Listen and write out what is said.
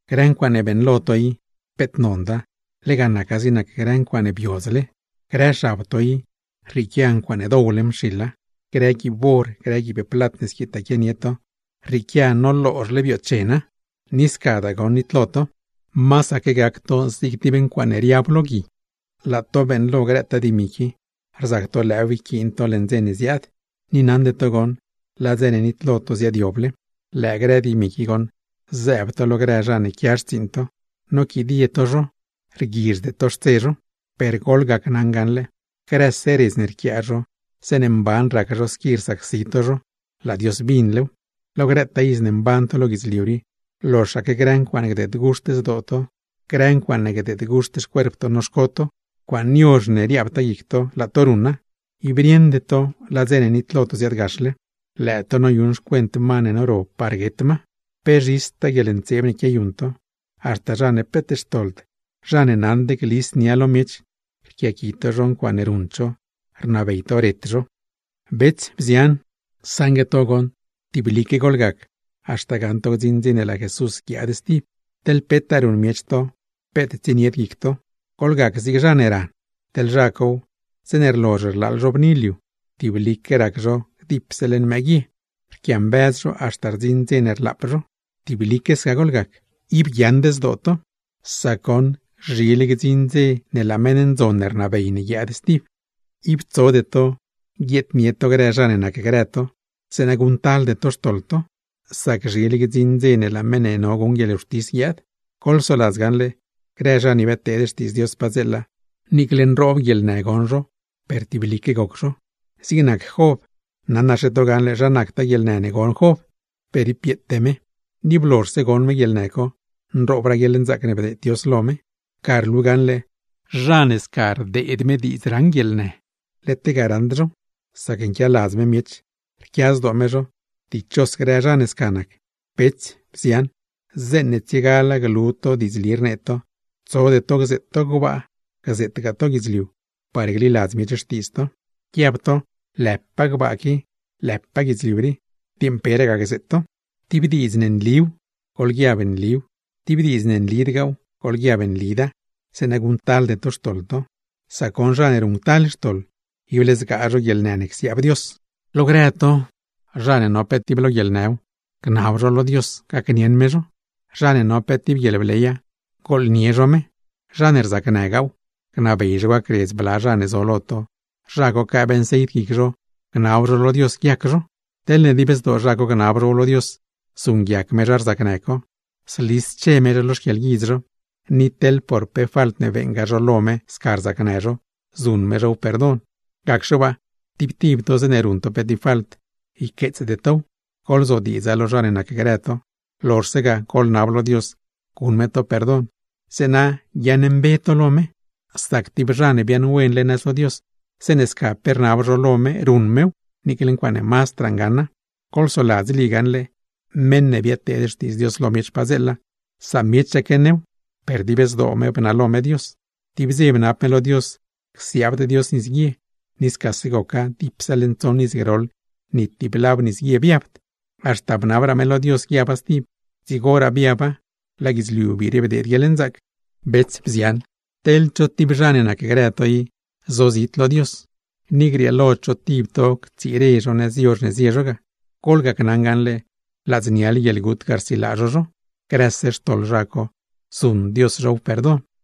Grë ncuaaṉe beeṉlo to i, peet nonda, lega naca zig nac grë ncuaaṉe biodzle; grë xab to i, rrieequia ncuaaṉe dowle mxiḻa. Grë guiib or, grë guiib plat ne squitaa quianie to, rrieequia noloozhle bioochena; ni scadaa goṉ nitlo to, masaque gac to zig tib ncuaaṉe riab lo gui. Laa to beeṉlo grëtaa dimi qui, rzac to lëëw yquiin to leṉ dze ne ziaad, ni naṉde to goṉ laa dze ne nitlo to ziaadyoble. Lëë grë dimi qui goṉ zëëb to lo grë zha ne quia xtsiiṉ to, noquidie to zho rguizhde to xtse zho. Per goḻgacnaṉa gaṉle, grëse redz ne rquiaa zho zeeṉe mban rac zho squi rsacsi to zho, laa Dios binlew. Lo grëtaa iz ne mban to lo guidzliu rii, loxaque grë ncuaaṉe gdeed guxt zdoo to, grë ncuaaṉe gdeed guxt xcuerp to noxco to, ncuaaṉe yozh ne riaabtaa guic to laa to ruṉa, ib rieṉde to laa dze ne nitlo to ziaadgaxle. ¡Lëë to noyuṉ xcuent ma ne noro par guet ma! Pe zhistaa guieḻntseeb ne quiayuṉ to, haxta zha ne peet xtoḻd, zha ne naṉd glis nia lo miech, rquiaqui to zho ncuaaṉe ruṉd zho, rnabey to ret zho. Bets, bzian, saṉgue to goṉ tiblique goḻgac haxta gaṉ to gdziṉ dze ne laa Jesús guiaad stib, teḻ petaa ruṉ miech to peet tsienied guic to. Goḻgac zig zha ne ran, teḻ zha cow, zeeṉe rlozh rlaaḻ zho bni liu, tiblique rac zho gdipse leṉ mëë guie, rquiambëz zho haxta rdziṉ dze ne rlaap zho. Tiblique sca goḻgac. ¡Ib guiaaṉd zdoo to, sac goṉ zhile gdziṉ dze ne laa meṉ ndzon ne rnabey ne guiaad stib! Ib tsode to guieednie to grë zha ne nacgrë to, zeeṉa guṉctalde to xtoḻ to; sac zhile gdziṉ dze ne laa meṉ ne no guṉ guieḻwxtis guiaad. Goḻsoladz gaṉle, grë zha ne biadteed xtiidz Dios padzeela, niicle nroob guieḻnë goṉ zho, per tiblique goc zho. Zig nac Job, naṉaxe to gaṉle zha nactaa guieḻnë ne goṉ Job, per ib bieete me, ni blozhse goṉ me guieḻnë co nroobraa guieḻnzaac ne bdeed Dios lo me. Ga rlu gaṉle, zha ne sca rdeed me diidz raṉ guieḻnë, led lega raṉd zhow; sac nquialadz me miech, rquia zdoo me zho. Dichos grë zha ne sca nac. Bets, bzian, zeeṉe tsiegala glu to diidzli rnee to, tsode to gzeet to gbaa, gzeetgaa to guidzliu par gliladz miech xtiidz to; guiab to: “Lëpaa gbaa qui”, “lëpaa guidzliu rii”, dieṉ peragaa gzeet to. Tib diidz ne nliw, goḻguiab: “Nliw”, tib diidz ne nlidgaaw, goḻguiab: “Nlida”, zeeṉa guṉctalde to xtoḻ to; sac goṉ zha ne ruṉctal xtoḻ, ible zgaa zho guieḻnë ne csiaab Dios. Lo grë to, zha ne no pe tib lo guieḻnëw, gnab zho lo Dios gacnieṉ me zho. Zha ne no pe tib guieḻbleya, gooḻnie zho me. Zha ne rzacnëgaaw, gnabey zho gacredz bla zha ne zo lo to, zha co quëëb nceit guic zho gnab zho lo Dios guiac zho. Teḻne dib zdoo zha co gnab zhow lo Dios, zuṉguiac Dios zha rzacnë co. Zlische me zho lo xquieḻguidz zho, ni teḻ por pe falt ne beeṉgaa zho lo me sca rzacnë zho, zuṉ me zhow perdon. Gacxe waa, tib tib to zeeṉe ruṉ to pe tib falt, yqueetsde tow, goḻzodiidza lo zha ne nacgrë to, lozhse ga goḻnab lo Dios guṉ me to perdon, zeeṉa guiaaṉmbe to lo me. Sac tib zha ne biaaṉwenle nëz lo Dios, zeeṉe sca pe rnab zho lo me ruṉ mew, niicle ncuaaṉe mazdraa ngaṉa. Goḻsoladz Lí gaṉle, meṉ ne biadteed xtiidz Dios lo miech padzeela, samiechaque new, per dib zdoo me bnalo me Dios. Tib dze bnab me lo Dios csiaabd Dios nisguie, ni scase goca, dipse leṉ tsoṉ iz groḻ ni tib lab nis guie biabd; haxta bnabraa me lo Dios guiaba stib, dzigoraa biaba, laa guidzliu biire bdeed guieḻnzaac. Bets, bzian, teḻ cho tib zha ne nacgrë to i sozit lo Xtiidz Dios, ni grieelo cho tib to ctsire zho nëz yozh ne zie zho ga; goḻgacnaṉ gaṉle, ladzniale guieḻgut ga rsilaa zho zho, grëse xtoḻ zha co zuṉ Dios zhow perdon. Santiagw